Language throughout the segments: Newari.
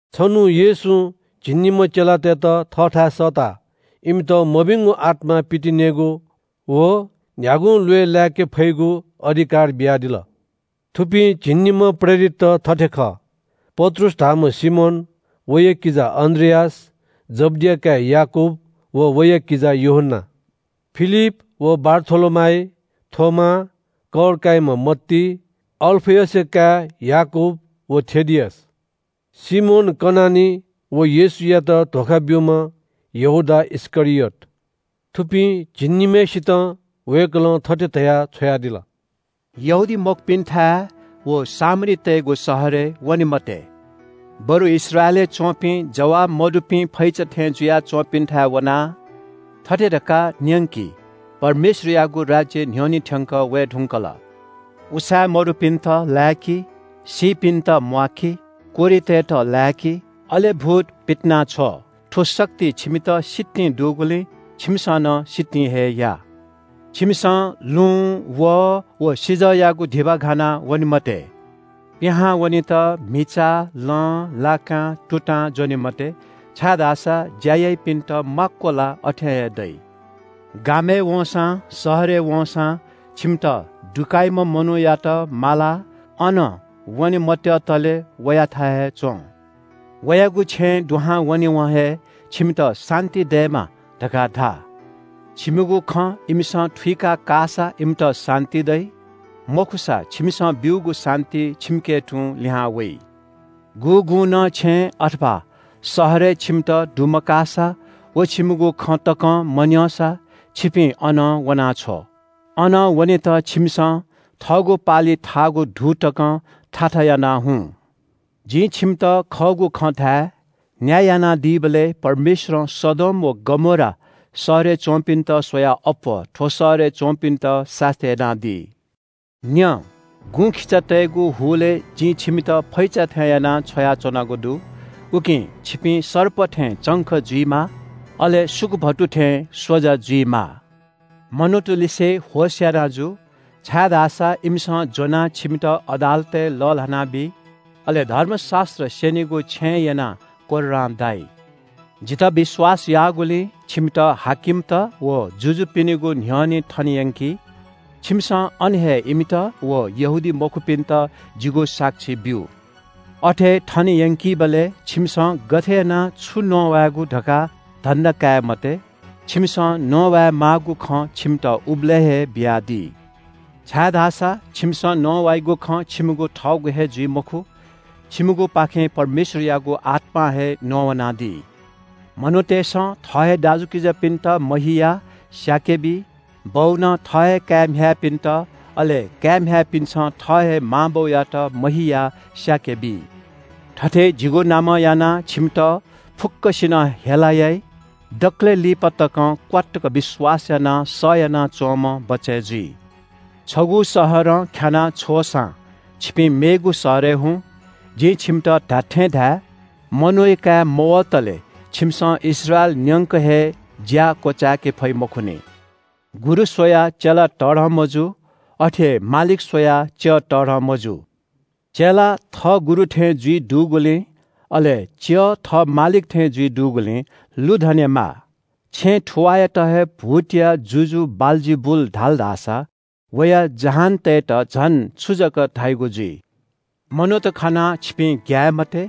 छन्‍हु येशूं झिंनिम्‍ह चेलातय्‌त थःथाय् सःताः इमित मभिंगु आत्‍मा पितिनेगु व न्‍ह्यागुं ल्‍वय् लाय्‌के फइगु अधिकार बियादिल। थुपिं झिंनिम्‍ह प्रेरितत थथे खः – पत्रुस धाःम्‍ह सिमोन, वया किजा अन्‍द्रियास, जब्‍दिया काय् याकूब व वया किजा यूहन्‍ना, फिलिप व बारथोलोमाइ, थोमा, कर काइम्‍ह मत्ती, अल्‍फयसया काय् याकूब व थेदियस, सिमोन कनानी व येशूयात धोखा ब्‍यूम्‍ह यहूदा इस्‍करियोत। थुपिं झिंनिम्‍हय्‌सितं वय्‌कलं थथे धयाः छ्वयादिल – “यहूदीमखुपिन्‍थाय् व सामरीतय्‌गु शहरय् वने मते। बरु इस्राएलय् च्‍वंपिं जवाः मदुपिं फैचात थें जुया च्‍वंपिन्‍थाय् वनाः थथे धकाः न्‍यंकि – ‘परमेश्‍वरयागु राज्‍य न्‍ह्यःने थ्‍यंकः वये धुंकल।’ उसाँय् मदुपिन्‍त लाय्‌कि, सीपिन्‍त म्‍वाकी, कोह्रितय्‌त लाय्‌कि, अले भूत पितिनाछ्व। थ्‍व शक्ति छिमित सितिं दुगुलिं छिमिसं नं सितिं हे या। “छिमिसं लुँ, वहः व सिजःयागु धिबा घाना वने मते। पिहां वनेत म्‍हिचा, लं, लाकां, तुतां ज्‍वने मते, छाय्‌धाःसा ज्‍या याइपिन्‍त माक्‍व ला अथें हे दइ। “गामय् वंसां शहरय् वंसां छिमित दुकाइम्‍ह मनूयात मालाः अनं वने मत्‍यतले वयाथाय् हे च्‍वँ। वयागु छेँय् दुहां वनेवं हे ‘छिमित शान्‍ति दयेमा’ धकाः धा। छिमिगु खँ इमिसं थुइका काःसा इमित शान्‍ति दइ, मखुसा छिमिसं ब्‍यूगु शान्‍ति छिमिके तुं लिहां वइ। गुगुं नं छेँय् अथवा शहरय् छिमित दुमकाःसा व छिमिगु खँ तकं मन्‍यंसा छिपिं अनं वनाछ्व। अनं वनेत छिमिसं थःगु पालिइ थाःगु धू तकं थाथा यानाः हुँ। जिं छिमित खःगु खँ धाये – न्‍याय यानादीबलय् परमेश्‍वरं सदोम व गमोरा शहरय् च्‍वंपिन्‍त स्‍वयाः अप्‍वः थ्‍व शहरय् च्‍वंपिन्‍त सास्‍ती यानादी।” “न्‍यँ, गुँखिचातय्‌गु हुलय् जिं छिमित फैचा थें यानाः छ्वयाच्‍वनागु दु। उकिं छिपिं सर्प थें चंख जुइमाः, अले सुकुभतु थें स्‍वजा जुइमाः। मनूतलिसे होश याना जु, छाय्‌धाःसा इमिसं ज्‍वनाः छिमित अदालतय् लःल्‍हानाबी। अले धर्मशास्‍त्र स्‍यनीगु छेँय् यनाः कोर्रां दाइ। जितः विश्‍वास याःगुलिं छिमित हाकिमत व जुजुपिनिगु न्‍ह्यःने थने यंकी। छिमिसं अन हे इमित व यहूदीमखुपिन्‍त जिगु साक्षी ब्‍यु। अथे थने यंकीबलय् छिमिसं गथे यानाः छु नवायेगु धकाः धन्‍धा काये मते। छिमिसं नवाये माःगु खँ छिमित उबलय् हे बियादी। छाय्‌धाःसा छिमिसं नवाइगु खँ छिमिगु थःगु हे जुइ मखु, छिमिगुपाखें परमेश्‍वरयागु आत्‍मां हे नवानादी। “मनूतय्‌सं थः हे दाजुकिजापिन्‍त महियाः स्‍याके बी। बौनं थः हे काय् म्‍ह्याय्‌पिन्‍त, अले काय् म्‍ह्याय्‌पिन्‍सं थः हे मां बौयात महियाः स्‍याके बी। थथे जिगु नामं यानाः छिमित फुक्‍कसिनं हेला याइ। दकलय् लिपा तकं क्‍वात्तुक विश्‍वास यानाः सह यानाच्‍वंम्‍ह बचय् जुइ। छगू शहरं ख्‍यानाः छ्वःसां छिपिं मेगु शहरय् हुँ। जिं छिमित धात्‍थें धाये – मनूया काय् मवतले छिमिसं इस्राएल न्‍यंक हे ज्‍या क्‍वचाय्‌के फइ मखुनि।” “गुरु स्‍वयाः चेला तःधं मजू। अथे हे मालिक स्‍वयाः च्‍यः तःधं मजू। चेला थः गुरु थें जुइ दुगुलिं, अले च्‍यः थः मालिक थें जुइ दुगुलिं लुधनेमाः। छेँ थुवाःयात हे भूतया जुजु बालजिबुल धाल धाःसा वया जहानतय्‌त झन छु जक धाइगु जुइ?” “मनूत खनाः छिपिं ग्‍याये मते।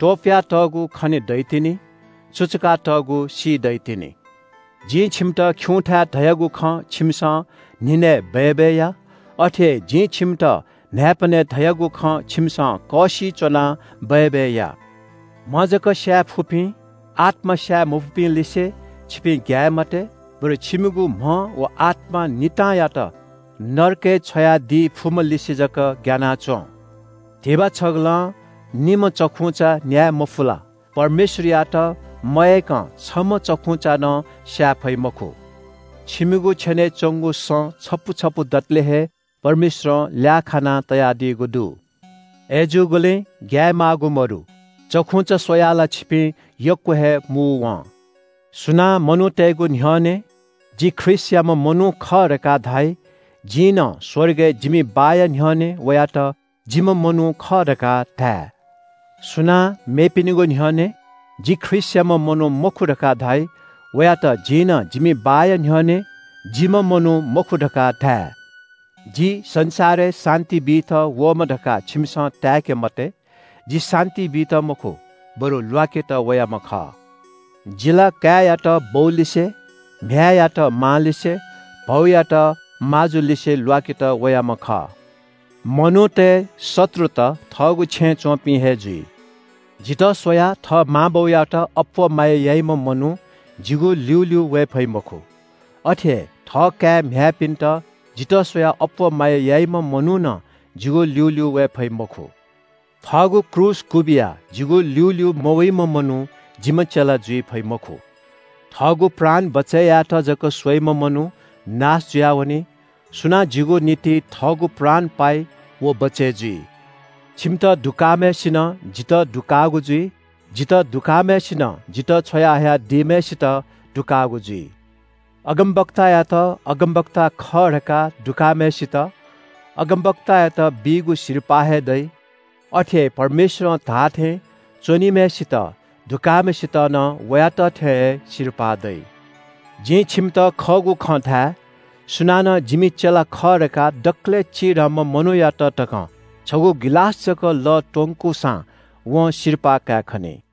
त्‍वपुयातःगु खने दइतिनि। सुचुकातःगु सी दइतिनि। जिं छिमित खिउँथाय् धयागु खँ छिमिसं न्‍हिनय् बय्‌बय् या। अथे हे जिं छिमित न्‍हाय्‌पनय् धयागु खँ छिमिसं कःसिइ च्‍वनाः बय्‌बय् या। “म्‍ह जक स्‍याये फुपिं, आत्‍मा स्‍याये मफुपिंलिसे छिपिं ग्‍याये मते। बरु छिमिगु म्‍ह व आत्‍मा नितांयात नरकय् छ्वयादी फुम्‍हलिसे जक ग्‍याना च्‍वँ। धिबा छगलं निम्‍ह चखुंचा न्‍याये मफु ला? परमेश्‍वरयात मयय्‌कं छम्‍ह चखुंचा नं स्‍याये फइ मखु। छिमिगु छेनय् च्‍वंगु सँ छपु छपु दतले हे परमेश्‍वरं ल्‍याः खाना तयादीगु दु। अय्‌जूगुलिं ग्‍याये माःगु मदु। चखुंचा स्‍वयाः ला छिपिं यक्‍व हे मू वं।” “सुनां मनूतय्‌गु न्‍ह्यःने ‘जि ख्रीष्‍टयाम्‍ह मनू खः’ धकाः धाइ, जिं नं स्‍वर्गय् जिमि बाःया न्‍ह्यःने वयात ‘जिम्‍ह मनू खः’ धकाः धाये। सुनां मेपिनिगु न्‍ह्यःने ‘जि ख्रीष्‍टयाम्‍ह मनू मखु’ धकाः धाइ, वयात जिं नं जिमि बाःया न्‍ह्यःने ‘जिम्‍ह मनू मखु’ धकाः धाये।” “जि संसारय् शान्‍ति बीत वःम्‍ह धकाः छिमिसं ताय्‌के मते। जि शान्‍ति बीत मखु, बरु ल्‍वाकेत वयाम्‍ह खः। “‘जि ला काय्‌यात बौलिसे, म्‍ह्याय्‌यात मांलिसे, भौयात माजुलिसे ल्‍वाकेत वयाम्‍ह खः। मनूतय् शत्रुत थःगु छेँय् च्‍वंपिं हे जुइ।’ “जितः स्‍वयाः थः मां बौयात अप्‍वः माया याइम्‍ह मनू जिगु ल्‍यूल्‍यू वये फइ मखु। अथे हे थःकाय् म्‍ह्याय्‌पिन्‍त जितः स्‍वयाः अप्‍वः माया याइम्‍ह मनू नं जिगु ल्‍यूल्‍यू वये फइ मखु। थःगु क्रूस क्‍वबिया जिगु ल्‍यूल्‍यू मवइम्‍ह मनू जिम्‍ह चेला जुइ फइ मखु। थःगु प्राण बचय् यायेत जक स्‍वइम्‍ह मनू नाश जुयावनी। सुनां जिगु निंतिं थःगु प्राण पाइ व बचय् जुइ।” “छिमित दुकाःम्‍हय्‌सिनं जितः दुकाःगु जुइ। जितः दुकाःम्‍हय्‌सिनं जितः छ्वया हयादीम्‍हय्‌सित दुकाःगु जुइ। अगमवक्तायात अगमवक्ता खः धकाः दुकाःम्‍हय्‌सित अगमवक्तायात बीगु सिरपाः हे दइ। अथे हे परमेश्‍वरं धाःथें च्‍वनीम्‍हय्‌सित दुकाःम्‍हय्‌सित नं वयात थें हे सिरपाः दइ। जिं छिमित खःगु खँ धाये – सुनानं जिमि चेला खः धकाः दकलय् चिधंम्‍ह मनूयात तकं छगू गिलास जक लः त्‍वंकूसां वं सिरपाः कायेखनी।”